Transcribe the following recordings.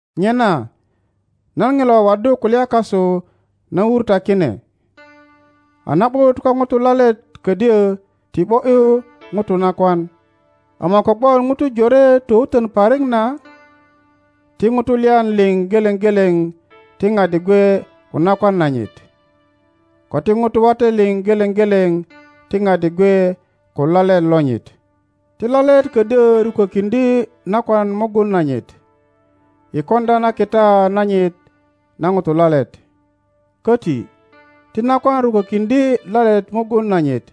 Nyena nan Ŋilo waddu kulya kasu na wur ta kine. A na ’but ko Ŋuto lalet ködyö ti ’bo ’yu ŋuro nakwan, ama kogwon Ŋutu jore towutön parik na, ti Ŋutu lyan liŋ geleŋ geleŋ ti ŋadi gwe ko nakwan nanyit, ko ti Ŋutu wate liŋ geleŋ geleŋ ti ŋadi gwe ko lalet lonyit. Ti lalet kodyo rukokiŋdye nakwan mugun nanyit i koŋdya na kita nanyit na Ŋuto lalet. Koti ti nakwan rukokiŋdye lalet mugun nanyit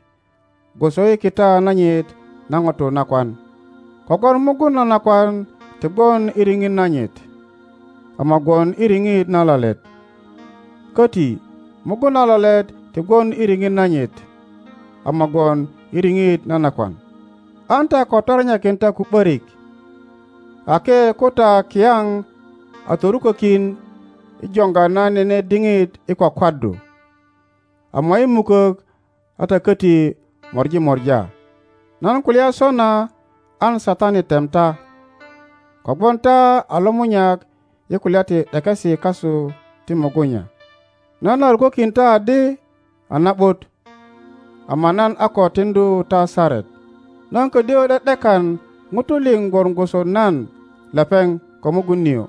gwoso i kita nanyit na Ŋuto nakwan. Kogwon mugun na nakwan ti gwon i riŋit nanyit, ama gwon i riŋit na lalet. Koti mugun na lalet ti gwon i riŋit nanyit, ama gwon i riŋit na nakwan. An ta ko torenyakin ta ko ’borik, ake ko ta kiyaŋ a torukokin i joŋga na nene diŋit i kwakwaddu, ama i mukok a ta koti mori mora. Nan kulya sona an Satani tem ta, kogwon ta a lomunyak i kulya ti ’dekesi kasu ti mugunya. Nan a rukokin ta adi a na ’but, ama nan a ko tiŋdu ta saret. Nan ködyö ’de ’dekan Ŋutu liŋ gwon gwoso nan lepeŋ ko mugun nio,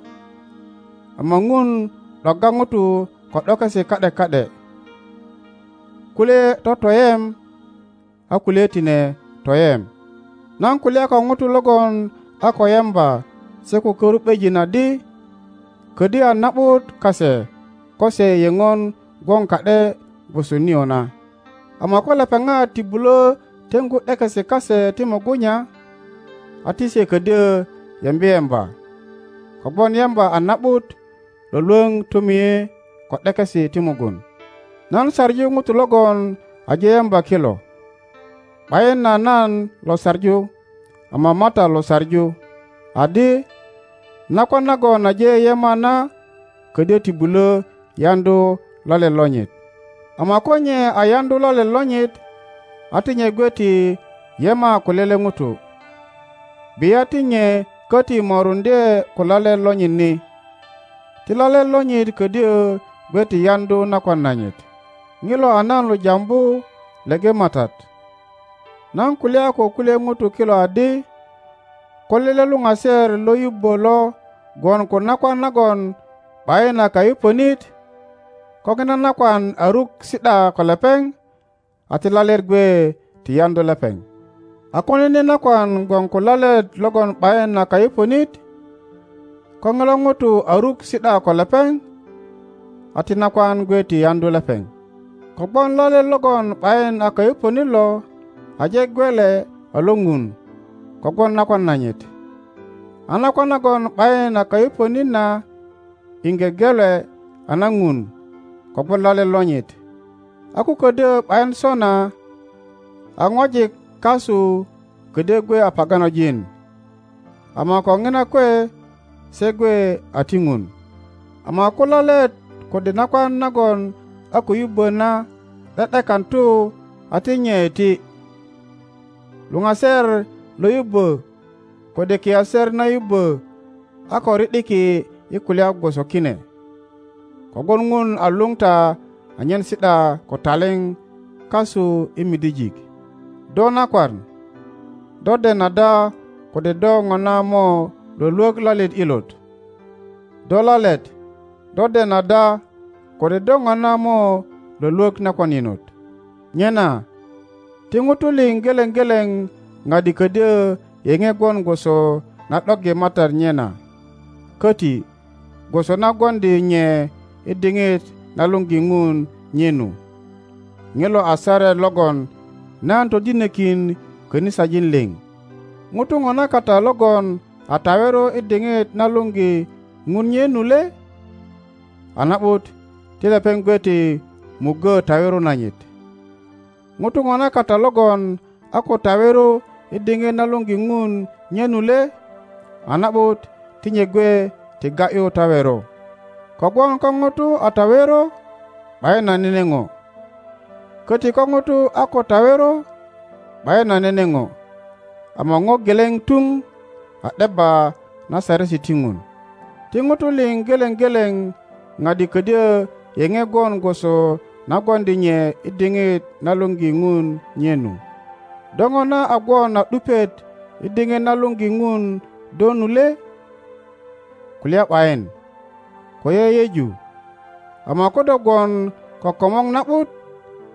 ama Ŋun ’dogga Ŋutu ko ’dokesi ka ’de ka ’de, kulye totoyem, a kulye tine toyem. Nan kulya ko Ŋutu logon a ko yemba se ko karu ’bejin adi, ködyö a na ’but kase ko se yeŋon gwon ka ’de gwoso nio na. Ama ko lepeŋat ti bulö teŋgu ’dekesi kase ti mugunya, a ti se ködyö yembi yemba. Kogwon yemba a na ’but lwölwöŋ tomie ko ’dekesi ti mugun. Nan saŋu Ŋutu logon aje yemba kilo, ’bayin a nan lo saŋu ama a Matat lo saŋu, adi, nakwan nagon aje yema na ködyö ti bulö yaŋdu lalet lonyit, ama ko nye a yaŋdu lalet lonyit, a ti nye gwe ti yema ko lele ŋuto, bia ti nye köti moruŋdye ko lalet lonyit ni. Ti lalet lonyit ködyö gwe ti yaŋdu nakwan nanyit. Ŋilo a nan lo jambu leŋe Matat, nan kulya ko kulye Ŋutu kilo adi, ko lele luŋaser lo yubbo lo gwon ko nakwan nagon ’bayin a kayupönit, ko Ŋina nakwan a ruk si ’da ko lepeŋ, a ti lalet gwe ti yaŋdu lepeŋ. A ko nene nakwan gwon ko lalet logon ’bayin a kayupönit, ko ŋilo Ŋuto a ruk si ’da ko lepeŋ, a ti nakwan gwe ti yaŋdu lepeŋ. Kogwon lalet logon ’bayin a kayupönit lo aje gelwe a lo Ŋun kogwon nakwan nanyit, a nakwan nagon ’bayin a kayupönit na iŋge gelwe a na Ŋun kogwon lalet lonyit, a ko ködyö ’bayin sona a Ŋwajik kasu ködyö gwe a paganojin, ama ko Ŋina kwe se gwe a ti Ŋun. Ama ko lalet kode nakwan nagon a ko yubbö na ’de ’dekan tu a ti nye iti. Luŋaser lo yubbö kode kiaser na yubbö a ko ri ’diki i kulya gwoso kine. Kogwon Ŋun a luŋ ta anyen si ’da ko taliŋ kasu i midijik. Do nakwan, do den ada kode do ŋona mo lwölwök lalet ilot? Do lalet, do den ada kode do ŋona mo lwölwök nakwan inot? Nyena ti Ŋutu liŋ geleŋ geleŋ ŋadi ködyö yeŋe gwon gwoso na ’doggi Matat nye na, köti gwoso na gwoŋdi nye i diŋit na luŋgi Ŋun nye nu. Ŋilo a saret logon nan todinikin kanisajin liŋ. Ŋuto ŋona kata logon a tawero i diŋit na luŋgi Ŋun nye nu le? A na ’but, ti lepeŋ gwe ti muggö tawero nanyit. Ŋuto ŋona kata logon a ko tawero i diŋit na luŋgi Ŋun nye nu le? A na ’but, ti nye gwe ti ga ’yu tawero. Kogwon ko Ŋuto a tawero ’bayin a nene ŋo, köti ko ŋuto a ko tawero ’bayin a nene ŋo, ama ŋo geleŋ tuŋ a ’debba na saresi ti Ŋun. Ti ŋutu liŋ geleŋ geleŋ padi ködyö yeŋe gwon gwoso na gwoŋdi nye i diŋit na luŋgi Ŋun nye nyu. Do ŋona a gwon a ’dupiet i diŋit na luŋgi Ŋun do nu le? Kulya ’bayin, ko yeyeju, ama ko do gwon ko komor na ’but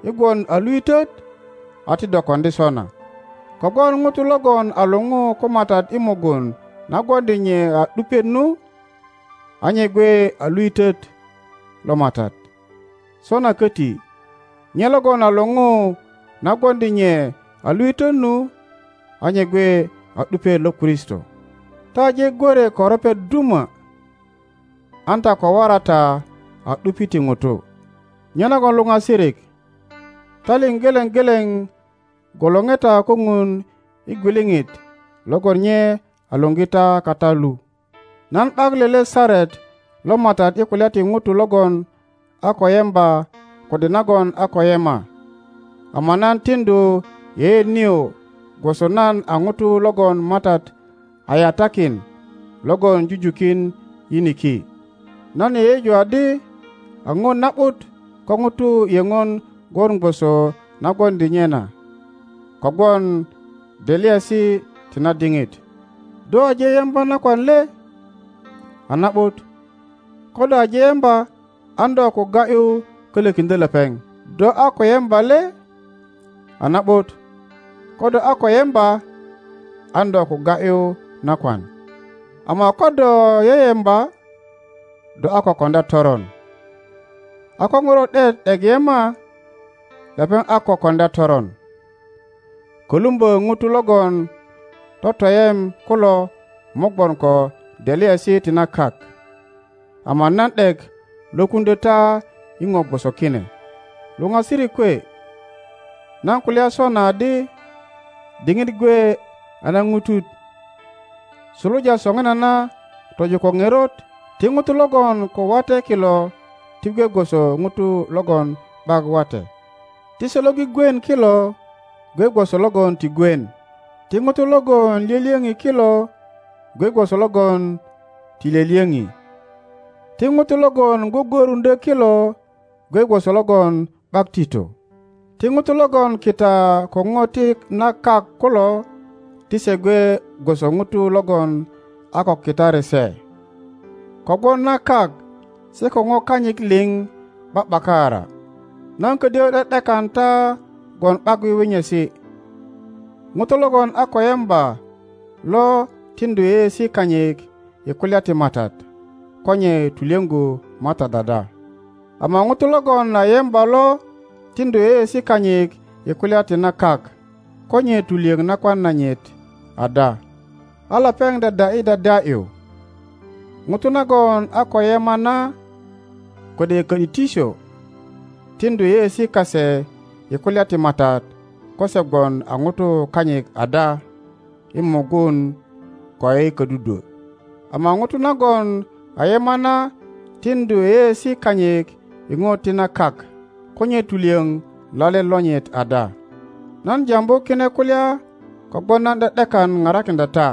i gwon a luitöt a ti do koŋdi sona. Kogwon ŋuto logon a luŋu ko Matat i mugun na gwoŋdi nye a ’dupiet nu, a nye gwe a luitöt lo Matat. Sona köti, nye logon a luŋu na gwoŋdi nye a luitöt nu, a nye gwe a ’dupiet lo Kristo. Ta aje gwö rwe ko ropet duma, an ta ko wora ta a ’dupi ti ŋutu. Nyenagon luŋasirik, ta liŋ geleŋ geleŋ gwolore ta ko Ŋun i gwiliŋit logon nye a luŋgi ta kata lu. Man ’bak lele saret lo Matat i kulya ti ŋuto logon a ko yemba kode nagon a ko yema, ama nan tiŋdu yeyeet nio gwoso nan a ŋuto logon Matat a yatakin logon jujukin yiniki. Nan yeyeju adi a ŋo na ’but ko ŋuto yeŋon gwon gwoso na gwoŋdi nye na, kogwon delyaesi ti na diŋit. Do aje yemba nakwan le? A na ’but, ko do aje yemba an do ko ga ’yu kolokiŋdyo lepeŋ. Do a ko yemba le? A na ’but, ko do a ko yemba an do ko ga ’yu nakwan. Ama ko do yeyemba, do a ko koŋdya toron; a ko ŋuro ’diet ’dek yema, lepeŋ a ko koŋdya toron. Kolumbo ŋutu logon totoyem kulo mo gwon ko delyaesi ti na kak, ama nan ’dek lwokuŋdyo ta i ŋo gwoso kine. Luŋasirik kwe, nan kulya sona adi, diŋit gwe a naŋutut. Suluja soŋinana tojo ko ŋerot, ti ŋutu logon ko wate kilo ti gwe gwoso ŋutu logon ’bak wate; ti se lo gwigwien kilo gwe gwoso logon ti gwien; ti ŋutu logon lyolyoŋi kilo gwe gwoso logon ti lyolyoŋi; ti ŋutu logon gwogworuŋdyo kilo gwe gwoso logon ’bak tito; ti ŋutu logon kita ko ŋo ti na kak kulo ti se gwe gwoso ŋutu logon a ko kitari se. Kogwon na kak se ko ŋo kanyit liŋ ’ba ’bakaara. Nan kodyo ’de ’dekan ta gwon ’bak wiwinyesi. Ŋuto logon a ko yemba lo tiŋdu yeyeesi kanyit i kulya ti Matat ko nye tulyoŋgu Matat ada; ama ŋuto logon a yemba lo tiŋdu yeyeesi kanyit i kulya ti na kak ko nye tulyoŋ nakwan nanyit ada, a lepeŋ dyadya ’yi dyadya ’yu. Ŋuto nagon a ko yema na kode ko ’disityo tiŋdu yeyeesi kase i kulya ti Matat ko se gwon a ŋutu kanyit ada i mugun ko i kodudwo. Ama ŋuto nagon a yema na tiŋdu yeyeesi kanyit i ŋo ti na kak ko nye tulyoŋ lalet lonyit ada. Nan Tambu kine kulya kogwon nan ’de ’dekan parakiŋdya ta,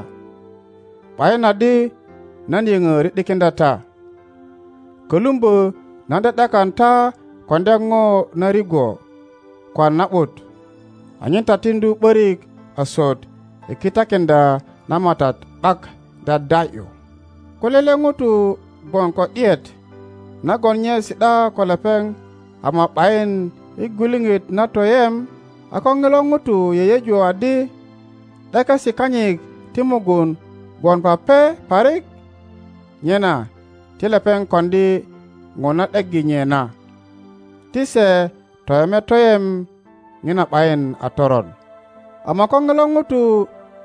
’bayin adi nan yoŋo ri ’dikiŋdya ta, kolumbo nan ’de ’dekan ta koŋdya ŋo na rigwo ko a na ’but, anyen ta tiŋdu ’borik asut i kitakiŋdya na Matat ’bak dyadya ’yu. Ko lele ŋuto gwon ko ’diet nagon nye si ’da ko lepeŋ ama ’bayin i gwiliŋit na toyem, a ko ŋilo ŋuto yeyeju adi ’dekesi kanyit ti mugun gwon pape parik, nyena ti lepeŋ koŋdi ŋo na ’deggi nye na; ti se toyeme toyem, ŋina ’bayin a toron. Ama ko ŋilo ŋuto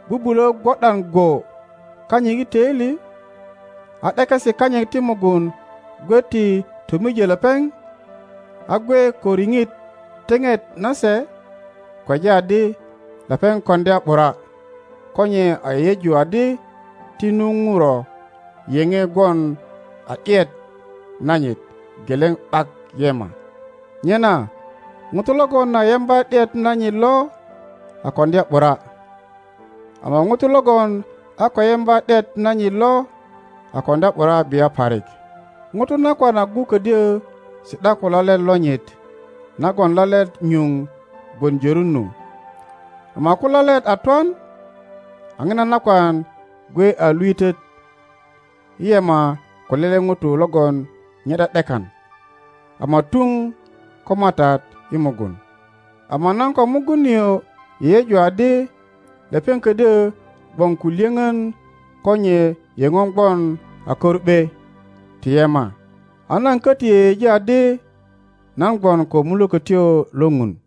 bubulo gwo ’dan go kanyit i toili, a ’dekesi kanyit ti mugun gwe ti tomijo lepeŋ, a gwe ko riŋit teŋet na se, kweja adi lepeŋ koŋdya ’bura ko nye a yeyeju adi ti nu ŋuro yeŋe gwon a ’diet nanyit geleŋ ’bak yema. Nyena ŋuto logon a yemba ’diet nanyit lo a koŋdya ’bura, ama ŋuto logon a ko yemba ’diet nanyit lo a koŋdya ’bura bia parik. Ŋuto nakwan agu kodyo si ’da ko lalet lonyit nagon lalet nyuŋ gwon jörun nu, ama ko lalet a twan, a ŋina nakwan gwe a luitöt i yema ko lele ŋuto logon nye ’de ’dekan, ama tuŋ ko Matat i mugun. Ama nan ko mugun nio yeyeju adi lepeŋ ködyö gwon ko lyöŋön ko nye yeŋön gwon a karu ’be ti yema. A nan köti yeyeji adi nan gwon ko Mulökötyo lo ŋun.